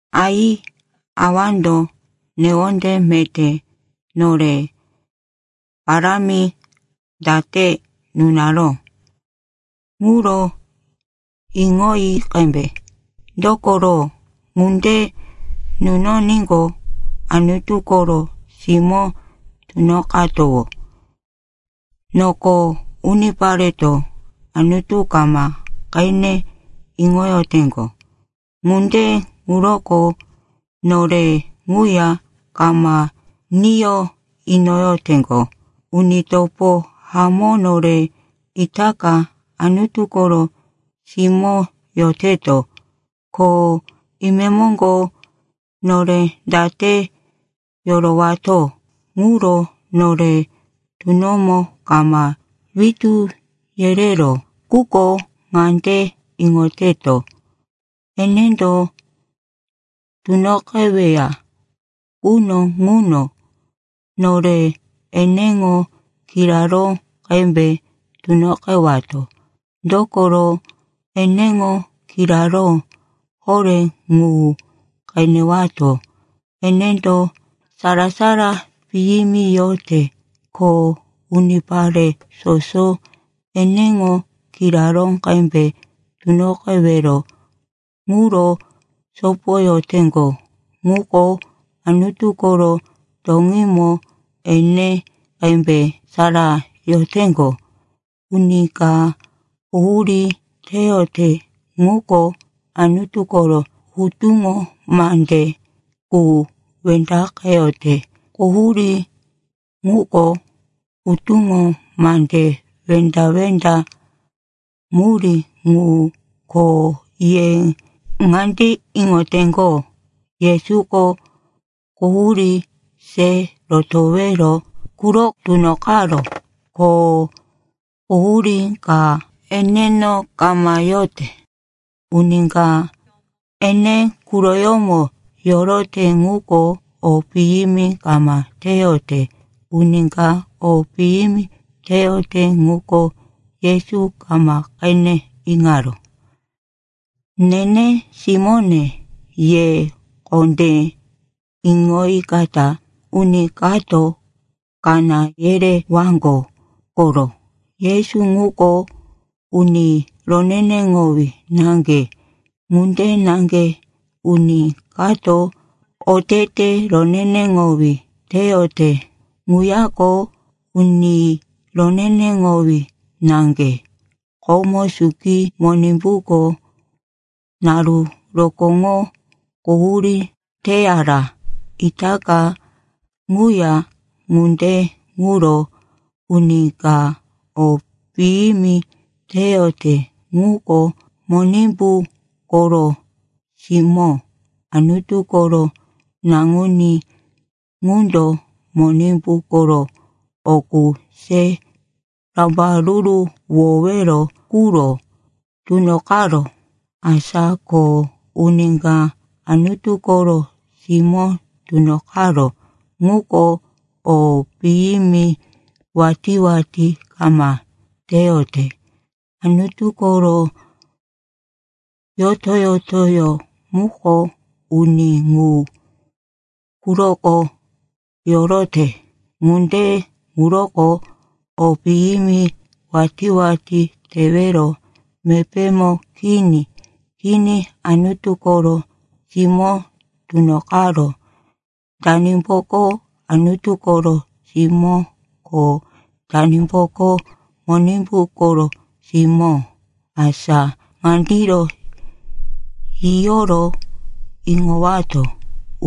Ai, Awando newonde meté nore parámi date nunaró ŋuro iŋoyi qembe! Dokoro ŋunde nunoníqo, Anutu koro simó tunoqatowó. Noko unipareto Anutu kama qene iŋoyoteŋgo, ŋunde ŋuroko nore ŋuya kama niyo iŋoyoteŋgo. Uni topo hamó, nore itaka Anutu koro simó yoteto, ko imemoŋgo nore date yorowato, ŋuro nore tunomo kama witú yereró. Quko ŋande iŋoteto, enendo tunoqeweya quno ŋuno nore eneŋo kiraró qembe tunoqewato. Dokoro eneŋo kiraró horé ŋu qenewato. Enendo sara-sara piyimi yote. Ko unipare soso eneŋo kiraró qembe tunoqewero ŋuro sopoyoteŋgo ŋuko, Anutu koro toŋímo ene qembe sara yoteŋgo. Uni ka quhurí teyote ŋuko Anutu koro hutuŋo mande qu wendaqeyote. Quhurí ŋuko hutuŋo mande wenda-wenda murí ŋu. Ko ye ŋande iŋoteŋgo, Yesuko quhurí se rotowero quro tunoqaró, ko quhurí ka eneno kama yote. Uni ka ene quroyómo yorote ŋuko, o piyimi kama teyote. Uni ka o piyimi teyote ŋuko Yesu kama qene iŋaró. Nene simóne, ye kondé iŋoyikata uni kato kaná yerewaŋgo koro. Yesu ŋuko uni roneneŋowí naŋge. Ŋunde naŋge uni kato otete roneneŋowí teyote ŋuyako uni roneneŋowí naŋge. Komo suki Monimbuko naru rokóŋo quhurí teyara, itaka ŋuya. Ŋunde ŋuro uni ka o piyimi teyote ŋuko Monimbu koro simó. Anutu koro Naŋuní ŋundo Monimbu koro o qu se rambaruruwowero quro tunoqaró. Asa ko uni ka Anutu koro simó tunoqaró ŋuko o piyimi watí-watí kama teyote. Anutu koro yoto-yotoyó muko uni ŋu quroko yorote, ŋunde ŋuroko o piyimi watí-watí tewero mepémo kini. Kini, Anutu koro simó tunoqaró. Danimboko Anutu koro simó, ko danimboko Monimbu koro simó? Asa ŋandiro yiyoro iŋowato,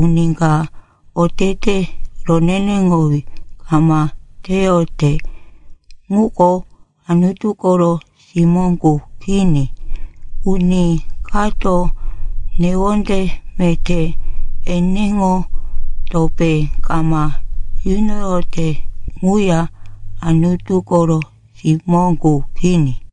uni ka otete roneneŋowí kama teyote ŋuko Anutu koro simó qu kini. Uni kato newonde meté eneŋo topé kama yunoyote ŋuya Anutu koro simó qu kini.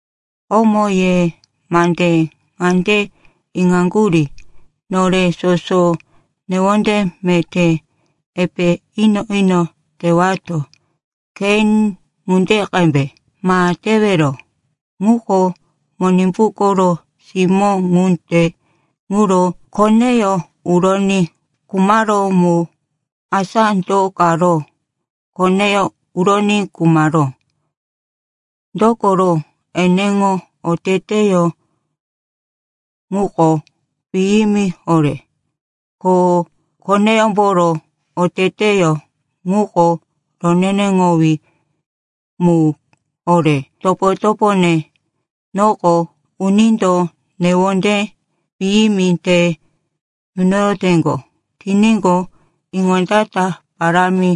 Komo ye mande ŋande iŋaŋgurí, nore soso newonde meté epe ino-ino tewato. Kein ŋunde qembe ma tewero. Ŋuko Monimbu koro simó, ŋunde ŋuro koneyó uroní khumaró ŋu. Asa do karo koneyó uroní khumaró? Dokoro eneŋo oteteyó ŋuko piyimi horé ko koneyómboro oteteyó ŋuko roneneŋowí mu horé. Topo-topone, noko unindo newonde piyimi te yunoyoteŋgo tiníqo, iŋondata parámi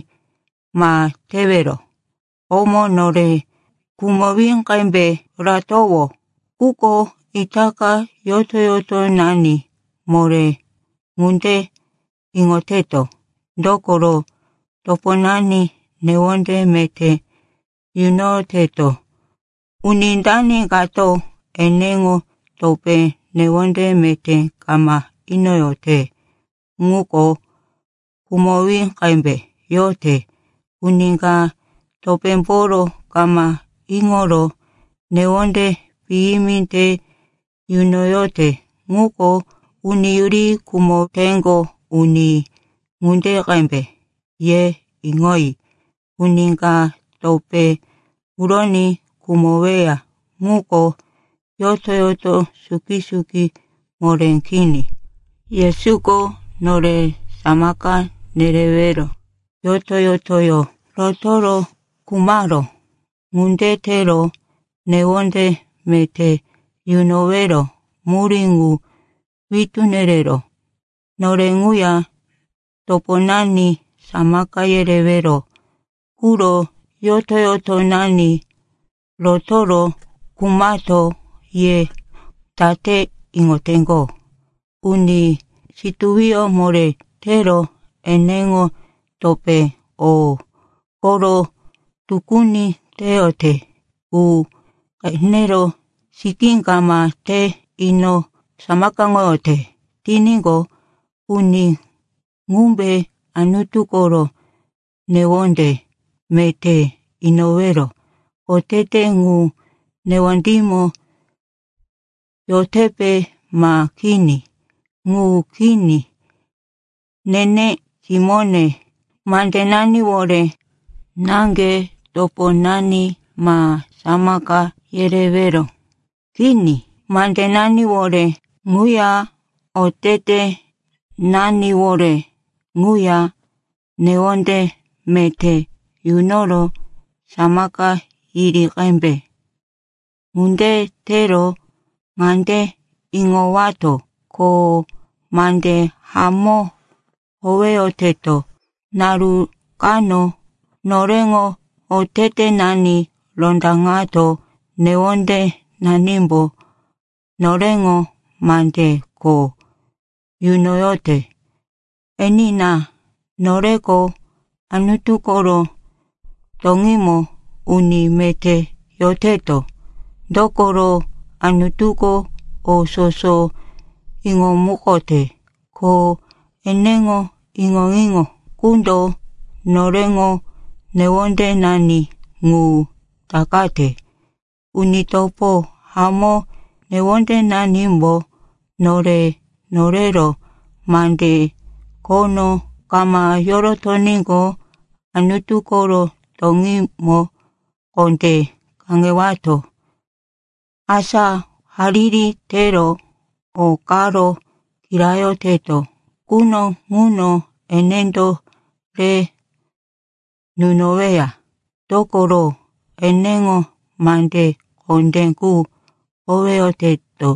ma tewero. Komo nore khumowí qembe yoratowó, quko itaka yoto-yotonani moré. Ŋunde iŋoteto, dokoro toponani newonde meté yunoyoteto. Uni dani kato eneŋo topé newonde meté kama inoyote ŋuko khumowí qembe yote. Uni ka topémboro kama iŋoro newonde piyimi te yunoyote ŋuko uni yuri khumoteŋgo uni ŋunde qembe. Ye iŋoyi, uni ka topé uroní khumoweya ŋuko yoto-yoto suki-suki moré kini. Yesuko nore samaka nerewero yoto-yotoyó rotoro khumaró. Ŋunde tero newonde meté yunowero murí ŋu witú nereró. Nore ŋuya toponani samaka yerewero quro yoto-yotonani rotoro khumato. Ye date iŋoteŋgo, uni situwiyó moré tero eneŋo topé o koro tukuni teyote qu qenero sikí kama te ino samakaŋoyote tiníqo, uni ŋumbe Anutu koro newonde meté inowero otete ŋu newondímo yotepe ma kini? Ŋu kini. Nene simóne, mandenaniwore naŋge toponani ma samaka yerewero. Kini, mandenaniwore ŋuya otetenaniwore ŋuya newonde meté yunoro samaka yiri qembe. Ŋunde tero ŋande iŋowato, ko mande hamó howeyoteto. Naru kano noreŋo otetenani rondaŋato newondenanimbo noreŋo mande kho yunoyote. Enina, noreko Anutu koro toŋímo uni meté yoteto. Dokoro, Anutuko o soso iŋomukote, ko eneŋo iŋo-iŋo qundo noreŋo newondenani ŋu takate. Uni topo hamó, newondenanimbo nore norero mande khono kama yorotoníqo, Anutu koro toŋímo kondé kaŋewato. Asa hariri tero o karo kirayoteto quno ŋuno enendo re nunoweya, dokoro, eneŋo mande kondé qu howeyoteto,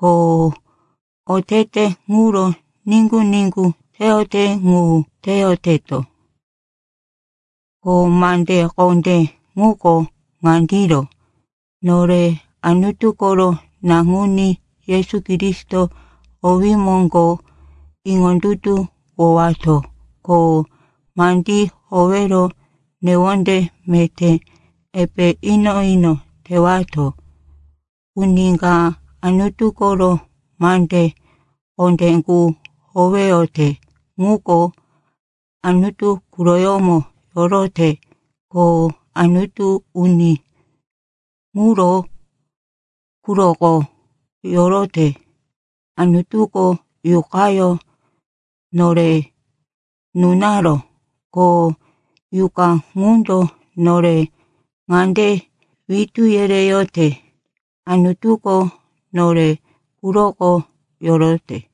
ko otete ŋuro niŋgu-niŋgu teyote ŋu teyoteto. Ko mande kondé ŋuko ŋandiro: nore Anutu koro Naŋuní Yesu Kristo owí moŋgo iŋondutuwowato, ko mandí howero newonde meté epe ino-ino tewato. Uni ka Anutu koro mande kondé qu howeyote ŋuko Anutu quroyómo yorote. Ko Anutuko uni ŋuro quroko yorote. Anutuko Yuqayó nore nunaró, ko Yuqa ŋundo nore ŋande witú yereyote, Anutuko nore quroko yorote.